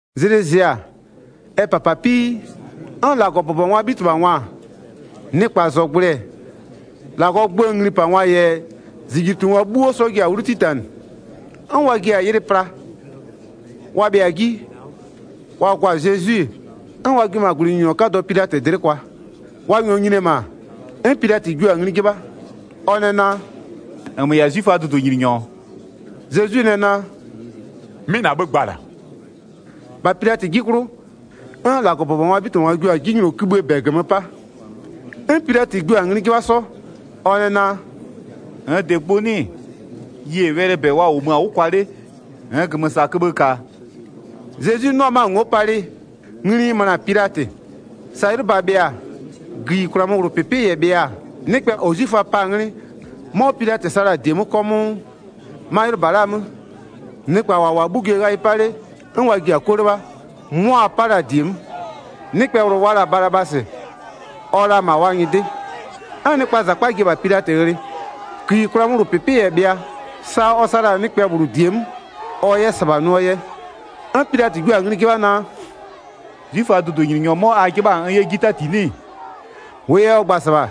Zlɩ zɩ-a, ɛ -papapii, 'n -Lagɔbʋbɔngwaa 'bhitɩbhangwa-a, nɩkpazɔgblʋɩ-ɛ, -Lagɔɔ gböö nglipangwa -yɛ -zijlitungwa 'bhuo 'sɔ ji-a 'wlu 'titanɩ, 'n wa ji-a yɩlɩ pla. Wa bhɩa-a 'ji, wa gwa-a Zezwi, 'n wa jio-o -ma -gwlɩnyininyɔ 'kadɔ Pilatɩ dlɩ'ɩ kwa. Wa -nyɔɔ nyini-e -ma, 'n Pilatɩ jio-a ngli 'jɩbha, ɔ nɛ naa: “-Nmö -yɛ-a 'zwiföaa dʋdʋnyininyɔ-ɔ?” Zezwi nɛ naa: “'Mɩ -na 'bhë gba-a -la.” 3-Bha Pilatɩ 'ji 'klʋ, 'n -Lagɔbʋbɔngwaa 'bhitɩbhangwa jio-a 'jinylɔkïbhïë -bɛ -gömö 'pa. 'N Pilatɩ jio-a ngli 'jɩbha 'sɔ, ɔ nɛ naa: “-Nn -dɩ gbʋ 'nɩ-ɩ? Yie wɛlɩɛ -bɛ wa -wʋmö-a 'wʋ kwa 'le -nn -gömösaköbhë -ka-a?” Zezwi 'nɩɔ 'mö-a ngo'o palɩ, ngli ɩ möna-a Pilatɩ. Sa 'ylʋba bhɩa-a, gïyikwlaa 'möwlʋpɩpɩ -yɛ bhɩa, nɩkpɛ -ɔ 'zwiföaa pa-a 'nglɩ, 'mɔ Pilatɩ sa la-a -die 'mö 'kɔmʋʋ. 'Ma 'ylʋba la'aa 'mö, nɩkpa -wa -wʋ-a 'bhugwie ghayɩ 'pa 'le 'n wa ji-a 'kuë 'lɩbha, 'mʋa wa 'pa la-a -die 'mö. Nɩkpɛ -bhlʋ wa la-a Balabasɩ, ɔ-ɔ la -ma wa nyɩdɩ. 'N nɩkpaa -zakpa ji-e -bha Pilatɩ ghlɩ. Gïyikwlaa 'möwlʋpɩpɩ -yɛ bhɩa, sa ɔ sa la-a nɩkpɛ -bhlʋ -die 'mö, ɔ 'yɛ -sɩbha nʋɔ yɛ. 'N Pilatɩ jua-a ngli 'jɩbha naa: “'Zwiföaa dʋdʋnyininyɔ 'mɔ a 'jɩbha-a n 'yɛ 'ji 'tati 'nɩ-ɩ?” 10-Wʋʋ yɛ ɔ gba-a -sɩbha,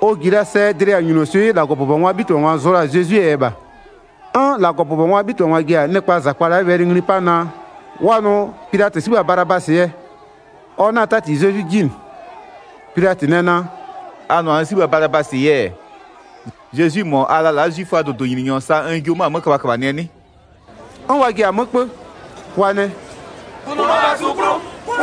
ɔ -ji la sɛ dlɩyawʋnyunoswɩ'ɩ -Lagɔbʋbɔngwaa 'bhitɩbhangwa zʋ la-a Zezwie yɛ -bha. 'N -Lagɔbʋbɔngwaa 'bhitɩbhangwa ji-a nɩkpaa -zakpa la'a wɛlɩ ngli 'pa naa, wa nʋ Pilatɩ 'sibha Balabasɩ yɛ, ɔ 'na-a 'tati Zezwi 'ji -nɩ. Pilatɩ nɛ naa: “A nʋ-a n 'sibha Balabasɩ yɛ-ɛ, Zezwi -mɔ a la-a la'a 'zwiföaa dʋdʋnyininyɔ, sa n jio-o 'mö-a 'mö köbhaköbhanɩɛ 'nɩ?” 'N wa ji-a 'mö 'kpö. Wa nɛ: “Kʋnʋɔ -bha su 'klʋ!”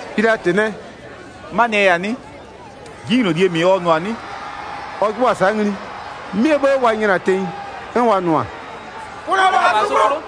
Pilatɩ nɛ: “'Manɩɛ yɛ-a 'nɩ? 'Jinylolie -mɩ ɔ nʋ-a 'nɩ?” Ɔ 'jɩbhʋa-a sa'a ngli, 'mɩɛ 'bhë wa nyla-a tenyi, 'n wa nʋ-a: “Kʋnʋɔ -bha su 'klʋ!”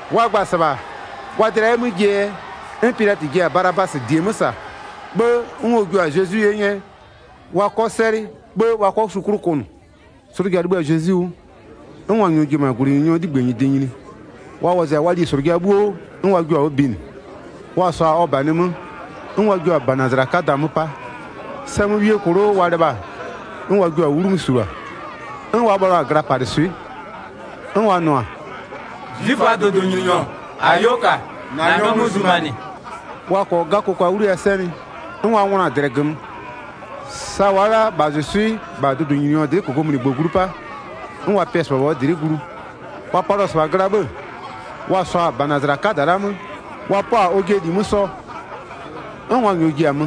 Wa gba-a -sɩbha wa dlɩa 'yɛ 'mö jie yɛ, 'n Pilatɩ ji-a Balabasɩ -die 'mö -sa. 'Bhë 'n ɔ jua-a Zezwi 'ye 'nyɛ, wa 'kɔ 'sɛlɩ, 'bhë wa 'kɔ su 'klʋ kʋnʋ. 'Slʋja 'libhï-a Zezwi 'wʋ, 'n wa -nyɔɔ ji-e -ma -gwlɩnyininyɔɔ 'ligbë -nyɩdɩ nyini. Wa wɔzɩ-a wa lislʋja 'bhuo, 'n wa jio-a 'wʋ binɩ. Wa -sɔɔ-a ɔ -banɩ 'mö, 'n wa jio-a -banazala 'kada 'mö 'pa. Sɛmöwiee klo'o wa lɩbha-a, 'n wa jio-a 'wlu 'mö -sulua. 'N wa bhalɩɔ-a glapalɩswɩ'ɩ, 'n wa nʋ-a: “'Zwiföaa dʋdʋnyininyɔ, -ayo -ka, -na nyɔmʋ zumanɩ.” Wa -kɔɔ 'gakokwa 'wliyawʋ 'sɛnɩ, 'n wa ngʋnɔ-a -dlɛ -gömö. Sa wa'a la'a -bhazʋswɩ'ɩ -bha dʋdʋnyininyɔ dlɩ'ɩ -kokomunigbö glu 'pa, 'n wa pɩ-ɛ -sɩbha -bha ɔ dlɩ'ɩ glu. Wa palɩɔ-ɔ -sɩbha gla 'bhë, wa -sɔɔ-a -banazala 'kada la'a 'mö, wa 'pɔ-a ɔjɩɛ -li 'mö 'sɔ, 'n wa -nyɔɔ ji-a mö,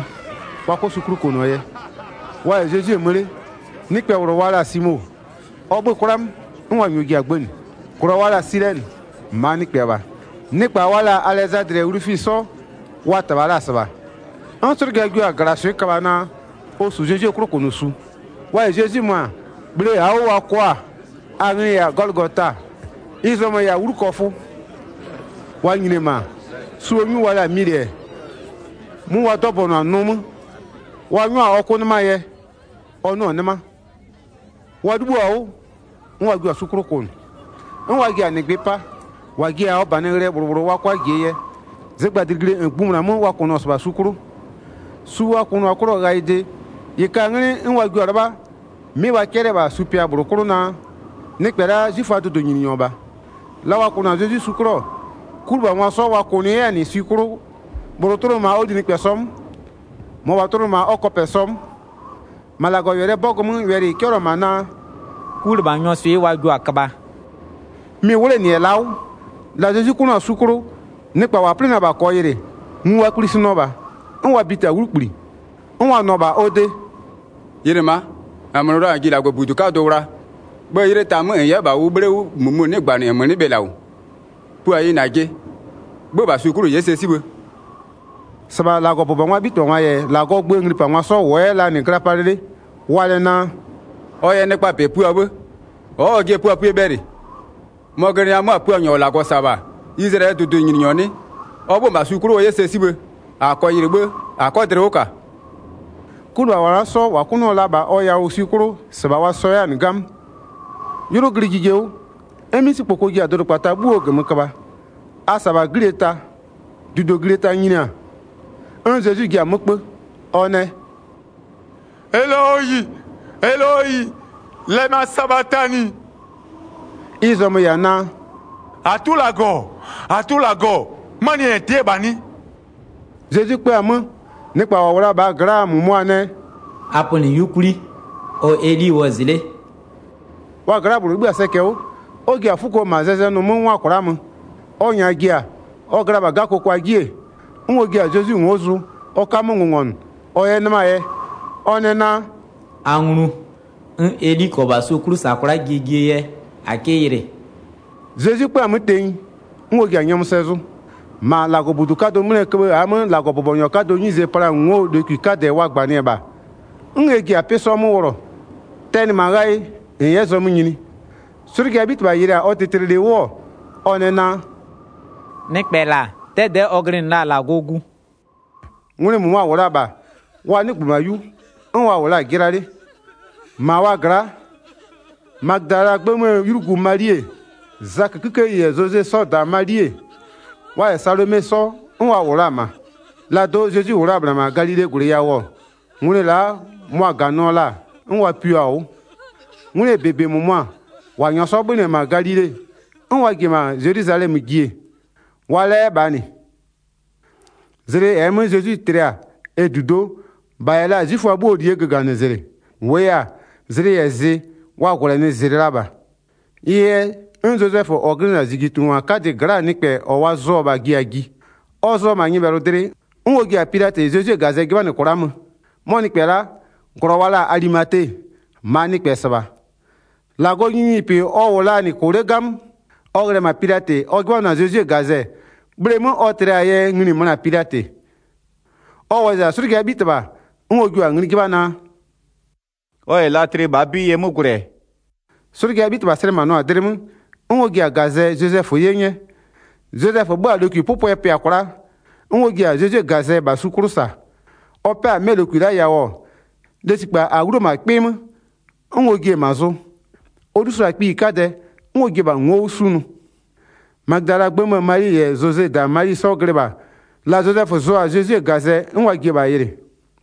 wa 'kɔ su 'klʋ kʋnʋɔ yɛ. Wa -yɛ Zezwi-e mö 'le, nɩkpɛ -bhlʋ wa la-a Simo, ɔ 'bhö-ö 'kwla 'mö, 'n wa -nyɔɔ ji-a gbënɩ. -Glɔ wa la-a Silɛnɩ, -maa nɩkpɛ -bha. Nɩkpa wa la-a Alɛzadlɩ -yɛ Wlufisɩ 'sɔ, wa -tɩbha la-a -sɩbha. 'N 'slʋja jio-a -glaswɩ'ɩ köbha naa, ɔ -su Zezwie 'klʋkʋnʋsu. Wa -yɛ Zezwi mö-a, bhle -aa 'wʋ wa kɔ-a, a nglɩ-ɩ -yɛ-a Gɔlʋgota. Ɩ zɔmö-ö -yɛ-a 'wlukɔfʋ. Wa nyini-e -ma, suo 'nyu wa la'a Milɩ-ɛ, 'mʋ wa 'dɔbɔnʋ-a nʋ 'mö, wa 'nyɔ-a ɔ 'kʋ 'nɩmaa yɛ, ɔ 'nʋ-ʋ -nɩ 'nɩma. Wa 'libhïo-a 'wʋ, 'n wa jio-a su 'klʋ kʋnʋ. 'N wa ji-a -nɩgbɩ 'pa, -wa ji-a ɔ -banɩ ghlɩɛ -bhlʋ -bhlʋ wa 'kʋa -jie yɛ. Zɩgbadlɩglie -ngbïmʋna 'mö wa kʋnʋɔ-ɔ -sɩbha su 'klʋ. Su wa kʋnʋɔ-a 'klʋɔ ghayɩde, -ɩ ka-a 'nglɩ 'n wa jio-a 'lɩbha, 'mɩ wa 'cɛlɩ-ɛ -bha supɩa -bhlʋ 'klʋ naa: “Nɩkpɛ la'a 'zwiföaa dʋdʋnyininyɔ -bha.” La wa kʋnʋ-a Zezwi su 'klʋ-ɔ, 'kulɩbhangwa 'sɔ wa kʋnʋ 'yɛ-a -nɩ swi 'klʋ. -Bhlʋ tʋnʋ -ma ɔ linɩkpɛsɔ 'mö, -mɔbha tʋnʋ -ma ɔ kɔpɛsɔ 'mö. [ 28-Ma -Lagɔwɛlɩɛ 'bɔgʋ 'mö wɛlɩ -ɩ 'cɛlɩɔ-ɔ -ma naa: “'Kulɩbhanyɔɔ swɩ'ɩ wa jio-a köbha,” mɩ-ɩ 'wlenɩ-ɛ la'a 'wʋ.] La Zezwi 'kʋnʋɔ-a su 'klʋ, nɩkpa -wa 'plɩnɩ-ɛ -bha -kɔɔ yɩlɩ-ɛ, ngu wa kplisinɩɔ -bha 'n wa biti-a 'wlukpli, 'n wa nʋ-ɔ -bha ɔ de: “Yɩlɩ ma'a, -nmö nʋ la-a -n ji -Lagɔbudu 'kadʋ wla, 'bhë 'ylɩ ta 'mö -n 'yɛ -bha ʋ 'bhle 'wʋ -mʋmʋ 'nɩgbanɩ-ɛ, -nmö 'nɩ bhe -la -wʋ? Pua yɩ -najɩ, 'bhö-ö -bha su 'klʋ -n 'yɛ sɛ 'sibhë.” 31-Sɩbha -Lagɔbʋbɔngwaa 'bhitɩbhangwa -yɛ -Lagɔɔ gböö nglipangwa 'sɔ -wʋɔ 'yɛ la-a -nɩ gla palɩ 'le. Wa nɛ naa: “Ɔ yɛ nɩkpaa -bɛ pua 'bhë, ɔ'ɔ ɔjɩɛ puapue bhɛlɩ. Mɔ-ɔ glɩnɩ-ɛ 'mö-a Puanyɔ -ɔ -Lagɔ -sa-a -bha, Izlayɛlɩɛ dʋdʋnyininyɔ 'nɩɩ, ɔ 'bhö-a 'mö -bha su 'klʋ ɔ 'yɛ sɛ 'sibhë -a -kɔɔ yɩlɩ 'bhë -a 'kɔ dlɩ 'wʋ -ka.” 'Kulɩbhangwa la'a 'sɔ -wa 'kʋnʋɔ la-a -bha ɔ yawʋ swi 'klʋ, sa wa sɔ 'yɛ-a -nɩ 'gamö. 'Ylʋ glɩ jije 'wʋ, 'n 'misikpoko ji-a dʋdʋkpata 'bhuoo -gömö köbha, a -sa -bha 'glie ta. 34-Dudoglie ta nyini-a, 'n Zezwi ji-a 'mö 'kpö, ɔ nɛ: “Eloyi, Eloyi, lɛma sabatani.” Ɩ zɔmö-ö -yɛ-a naa: “-Atʋ -Lagɔ, -Atʋ -Lagɔ, 'manɩɛ yɛ -n tɩ'ɩ-ɛ -bha 'nɩ?” Zezwi 'kpö-a 'mö, nɩkpa -wa -wʋ la-a -bhaa gla'aa -mʋmʋa nɛ: “A pönɩ 'yukwli, ɔ-ɔ Eli wɔzɩ 'le.” Wa gla'aa nɩkpɛ -bhlʋ 'libhï-a sɛcɛ 'wʋ, 'n ɔ ji-a 'fuko -ma zɛzɛnʋ 'mö -ngwa kwla'a mö. Ɔ -nyaa ji-a, ɔ gla-a -bha 'gakokwa 'ji-e, 'n ɔ jia-a Zezwi ngo'o zʋ, ɔ 'ka 'mö ngʋngɔnʋ ɔ 'yɛ 'nɩmaa yɛ. Ɔ nɛ naa: “A nglu, 'n Eli -kɔɔ -bha su 'klʋ -sa kwla'a jie jie yɛ, -a 'kɩ yɩlɩ.” Zezwi 'kpö-a 'mö tenyi, 'n ɔ ji-a nyɔmʋ sɛ zʋ. 38-Ma -Lagɔbudu 'kadʋ 'mlɩɛ köbhë -aa 'mö -Lagɔbʋbɔnyɔ 'kadɔɔ 'nyize pla-aa ngo'oo lokwi 'kadɛ wa -gbanɩ-ɛ -bha, 'n ɛ ji-a 'pɩ 'sɔ 'mö wʋlɔ, tɛnɩ -ma ghayɩ -n 'yɛ zɔmö nyini. 'Slʋjaa 'bhitɩbha yɩlɩ-a ɔ tlɩtlɩlɩ 'wʋ-ɔ, ɔ nɛ naa: “Nɩkpɛ -la 'dɛdɛ'ɛ ɔ glɩnɩ la-a -Lagɔɔ Gu.” Ngwlɩ -mʋmʋa-a -wʋ la-a -bha, wa 'nɩgbö -ma 'yu, 'n wa -wʋ la-a 'jɩla 'le. -Ma wa gla'a, Magödalaa 'gbë 'möö 'ylugu Mali-e, Zakö 'kikeyi -yɛ Zoze 'sɔɔ -da Mali-e, wa -yɛ Salome 'sɔ 'n wa -wʋ la-a -ma. La do'o Zezwi -wʋ la-a -bhla -ma Galilee -gwlɩ yawʋ-ɔ, ngwlɩ la'a mʋa-a -ganɩɔ la-a, 'n wa pio-a 'wʋ. 'Ngwlɩɛ -bebe -mʋmʋa, -wa -nyɔɔ 'sɔ 'bhönɩ-ɛ -ma Galile, 'n wa ji-e -ma Zelwizalɛmö ji-e, wa-a la 'yɛ -bha -nɩ. Zlɩ -ɛɛ 'mö Zezwi tlɩ-a ɛ -dudo'o, -bha -yɛ la-a 'zwiföa 'bhuoo -lie göganɩzlɩ. -Wʋʋ yɛ-a, zlɩ -yɛ zɩ, wa -gwlɛnɩzlɩ la -bha. Ɩ yɛ 'n Zozɛfö -ɔ glɩnɩ-a -zijlitungwa 'kadɩɛ gla'aa nɩkpɛ -ɔ wa zʋ-ɔ -bha ji-a ji. Ɔ zʋ-ɔ -ma nyɩbhɛlʋdlɩ, 'n ɔ ji-a Pilatɩ Zezwie -gazɛ 'jɩbhanɩ kwla'a mö. 'Mɔ nɩkpɛ la'a, -glɔ wa la-a Alimate, -maa nɩkpɛ-ɛ -sɩbha. -Lagɔɔ nyininyinipɩ ɔ -wʋ 'yɛ la-a -nɩ -kʋ 'le 'gamö. Ɔ ghlɩ-ɛ -ma Pilatɩ ɔ 'jɩbhanɩɔ-a Zezwie -gazɛ-ɛ, bhleemö ɔ tlɩ-aa yɛ ngli-i möna-a Pilatɩ. Ɔ wɔzɩ-a 'slʋjaa 'bhitɩbha, 'n ɔ jio-a ngli 'jɩbha naa: “Ɔ -yɛ la tlɩ -bhaa 'bɩ yɛ 'mö gwlɛ-ɛ?” 'Slʋjaa 'bhitɩbha slɛmanɩɔ-a dlɩ 'mö, 'n ɔ ji-a -gazɛ Zozɛfö 'ye 'nyɛ. Zozɛfö 'bhö-a lokwipʋpʋɛ pɩa kwla'a, 'n ɔ ji-a Zezwie -gazɛ -bha su 'klʋ -sa, ɔ 'pɛ-a 'mɛ lokwi la'a yawʋ-ɔ, lesikpa -a 'wluo-o -ma 'kpɩ 'mö, 'n ɔ jie-e -ma zʋ. Ɔ 'lusʋa-a kpiyi 'kadɛ 'n ɔ jie-e -bha ngo'o 'wʋ 'sunʋ. Magödalaa 'gbë 'möö Mali -yɛ Zozee -da Mali 'sɔ glɩ -bha, la Zozɛfö zʋ-a Zezwie -gazɛ 'n wa ji-e -bha yɩlɩ.